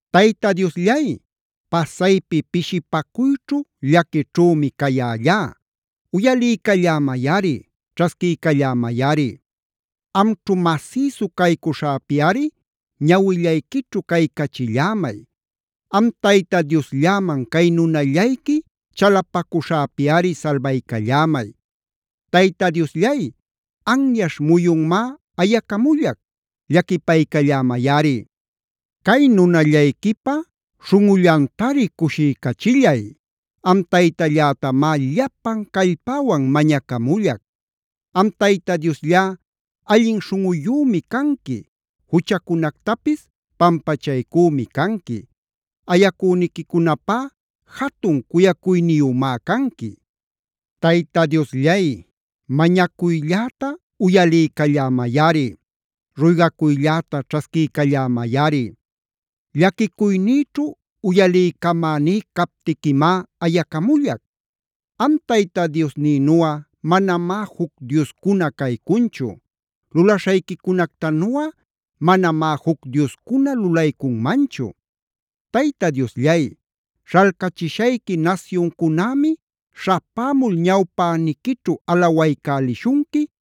Tayta Diosllay, pasaypi pishipacuyćhu llaquićhümi cayällá; uyaliycallämayꞌari, ćhasquiycallämayꞌari. Amćhu masïsu caycuśhäpiꞌari ñawillayquićhu caycachillämay. Am Tayta Dioslläman cay nunallayqui chalapacuśhäpiꞌari salbaycallämay. Tayta Diosllay, anyaśh muyunmá ayacamullac, llaquipaycallämayꞌari. Cay nunallayquipa śhunꞌullantari cushiycachillay, am Taytallätamá llapan callpäwan mañacamullac. Am Tayta Diosllá, allin śhunꞌuyümi canqui, juchacunactapis pampachaycümi canqui. Ayacüniquicunapá jatun cuyacuyniyümá canqui. Tayta Diosllay, mañacuylläta uyaliycallämayꞌari. Ruygacuylläta ćhasquiycallämayꞌari. Llaquicuynïćhu uyaliycamäní captiquimá ayacamullac. Am Tayta Diosnïnuꞌa manamá juc dioscuna caycunchu. Lulaśhayquicunactanuꞌa manamá juc dioscuna lulaycunmanchu. Tayta Diosllay, śhalcachishayqui nasyuncunämi śhapämul ñawpäniquićhu alawaycälishunqui,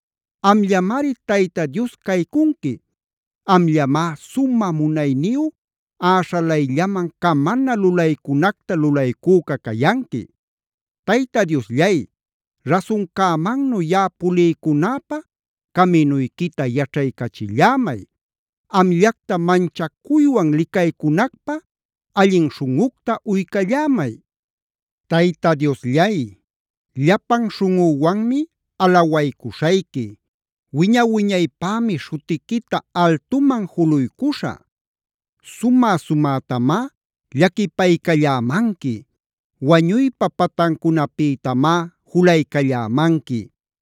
Amllamari Tayta Dios caycunqui. Amllamá sumä munayniyu, äśhalayllaman camana lulaycunacta lulaycüca cayanqui. Tayta Diosllay, rasuncämannu yaꞌa puliycunäpä caminuyquita yaćhaycachillämay. Amllacta manchacuywan licaycunacpä allin śhunꞌucta uycallämay. Tayta Diosllay, llapan śhunꞌüwanmi alawaycuśhayqui. Wiña-wiñaypämi śhutiquita altuman juluycuśhä. Sumä-sumätamá llaquipaycallämanqui. Wañuypa patancunapïtamá julaycallämanqui.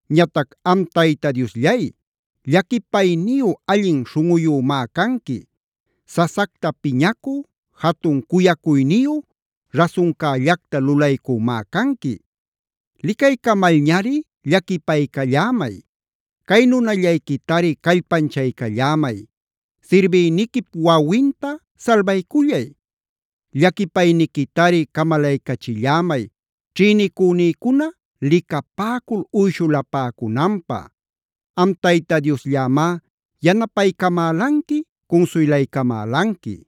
Ñatac am Tayta Diosllay, llaquipayniyu allin śhunꞌuyümá canqui. Sasacta piñacü, jatun cuyacuyniyu, rasuncällacta lulaycümá canqui. Licaycamalñari llaquipaycallämay. Cay nunallayquitari callpanchaycallämay. Sirbïniquip wawinta salbaycullay. Llaquipayniquitari camalaycachillämay ćhïnicünïcuna licapäcul uyshulapäcunanpä. Am Tayta Diosllämá yanapaycamälanqui, cunsuylaycamälanqui.